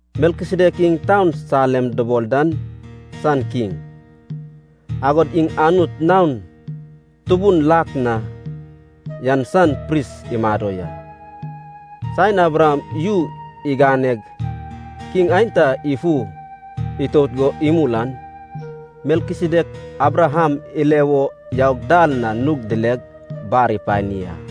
Melkisedek iŋ taun Salem dubol dan san kiŋ, agod iŋ Anut Naon Tubun Lak Na yan san pris imado ya. Saen Abraham yu iganeg kiŋ aenta ifu itout go imul an, Melkisedek Abraham ile wo yaug dal na nug dileg bar ipani a.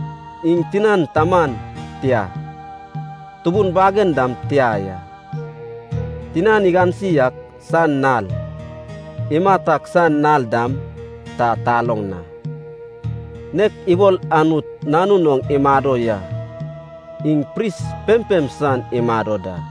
Iŋ tinan taman tia, tubun bagen dam tia ya. Tinan igansi ak san nal, imat ak san nal dam ta taloŋ a. Nek ibol Anut Nanun oŋ imado ya, iŋ pris pempem san imado da.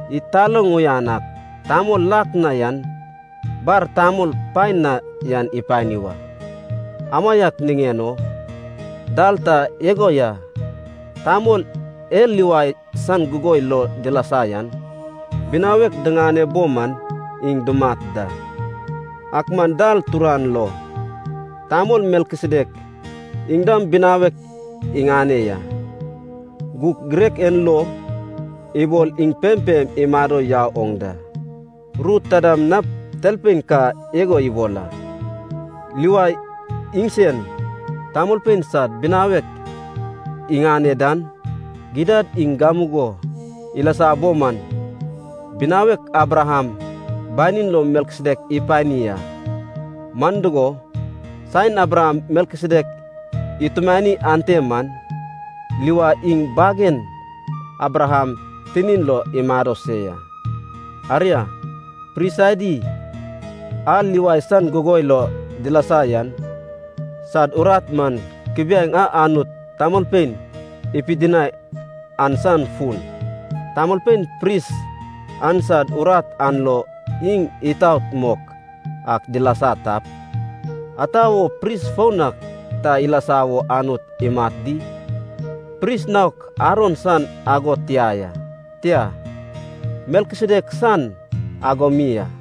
Id taloŋ uyan ak tamol lak na yan bar tamol paen na yan ipani wa. Amaiak niŋen o dal ta igo ya, tamol e Livai san gugoi lo dilasa yan binawek diŋane bo man iŋ dumat da. Ak man dal turan lo, tamol Melkisedek iŋ dam binawek iŋane ya, gug girek en lo ibol iŋ pempem imado yau oŋ da. Ru ta dam nap talpein ka igo ibol a, Livai iŋsen, tamolpein sad binawek iŋane dan, gidad iŋ gamugo ilasa bo man binawek Abraham banin lo Melkisedek ipani a. Man dugo, saen Abraham Melkisedek itumani ante man, Livai iŋ bagen Abraham tinin lo imado se ya. Aria, pris adi a Livai san gugoi lo dilasa yan sad urat man kubiaeŋ a Anut tamolpein ipidinai an san fun. Tamolpein pris an sad urat an lo iŋ itaot mok ak dilasa tap, anta wo pris foun ak ta ilasa wo Anut imat di? Pris naok Aron san ago tia ya, tia, Melkisedek san ago mi a.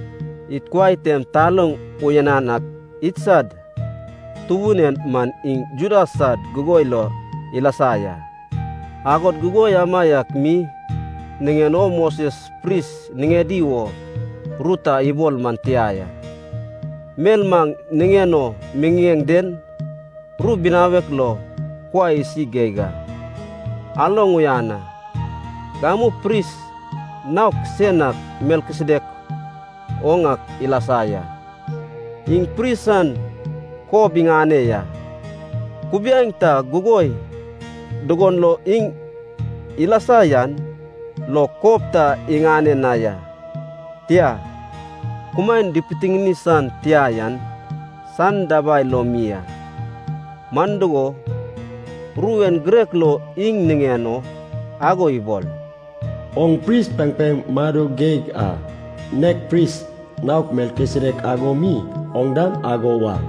Id kuai tem taloŋ uyanan ak idsad Tubun en man iŋ Juda san gugoi lo ilasa ya. Agod gugoi amaiak mi niŋen o Moses pris niŋedi wo ru ta ibol man tia ya. Mel maŋ niŋen o miŋiŋeŋ den ru binawek lo kuai isi geig a. Aloŋ uyan a. Gamu pris naok sen ak Melkisedek oŋ ak ilasa ya. Iŋ pris san kob iŋane ya, kubiaeŋ ta gugoi dugon lo iŋ ilasa yan lo kob ta iŋane na ya, tia, kumaen dipitiŋini san tia yan san dabai lo mi a. Man dugo, ru en girek lo iŋ niŋen o ago ibol, “Oŋ pris pempem mado geig a, nek pris naok Melkisedek ago mi oŋ dam ago wa.”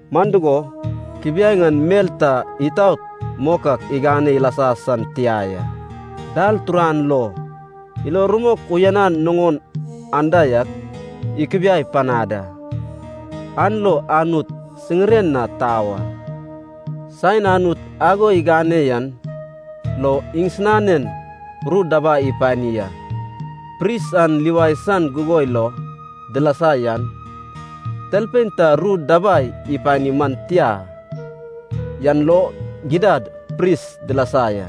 (Man dugo, kubiaeŋ an mel ta itaot mok ak igane ilasa san tia ya.) Dal turan lo, ilo rumok uyanan nuŋon anda yak ikubiai panad a, an lo Anut siŋiren na tau a. Saen Anut ago igane yan lo iŋsinanen ru dabai ipani a. Pris an Livai san gugoi lo dilasa yan, talpein ta ru dabai ipani man tia yan lo gidad pris dilasa ya.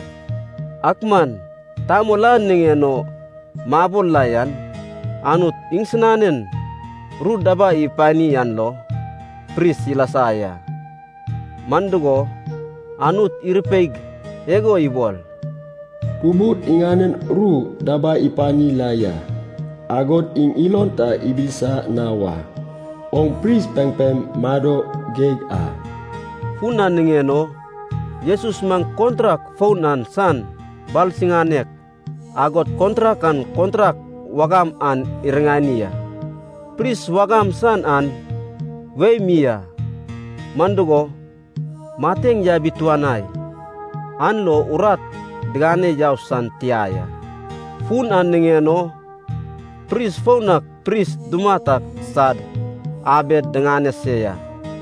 Ak man tamol a niŋen o mabol la yan Anut iŋsinanen ru dabai ipani an lo pris ilasa ya. Man dugo, Anut irupeig igo ibol, “Tubud iŋanen ru dabai ipani la ya, agod iŋ ilon ta ibilisa na wa. Oŋ pris pempem mado geig a.” Fun an niŋen o Jesus man kontrak foun an san balsiŋanek, agod kontrak an kontrak wagam an iriŋani a. Pris wagam san an wei mi a, man dugo, mateŋ yabituanai, an lo urat digane yau san tia ya. Fun an niŋen o pris foun ak pris dumat ak sad abed diŋane se ya.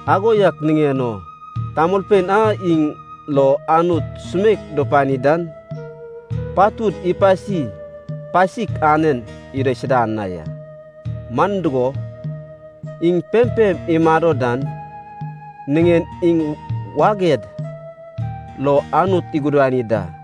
Ago yak niŋen o tamolpein a iŋ lo Anut sumeik dupani dan patud ipasi pasik anen idaisuda ya. Man dugo, iŋ pempem imado dan niŋen iŋ waged lo Anut igudani da.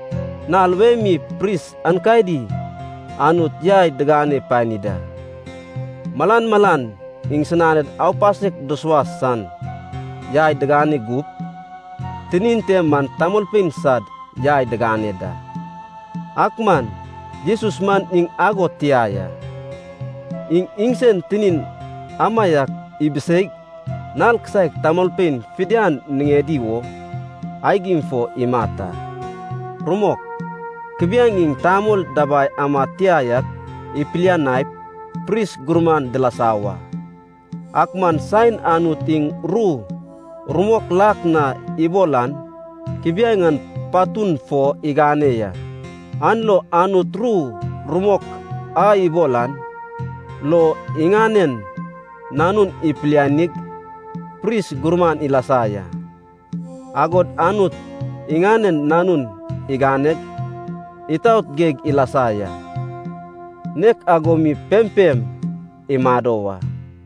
Nal wei mi pris aenkadi Anut yai digane pani da, malan malan iŋsinad aupasek dusuas san yai digane gup tinin te man tamolpein sad yai digane da. Ak man Jesus man iŋ ago tia ya, iŋ iŋsen tinin amaiak ibiseig nal kisaek tamolpein fidian niŋedi wo aigim fo imat a. Rumok, kubiaeŋ iŋ tamol dabai amad tia yak ipilianaip pris gurman dilasa wa. Ak man saen Anut iŋ ru rumok lak na ibol an kubiaeŋ an patun fo igane ya. An lo Anut ru rumok a ibol an lo, iŋanen Nanun ipilianig pris gurman ilasa ya. Agod Anut iŋanen Nanun iganeg itaot geig ilasa ya, nek ago mi pempem imado wa.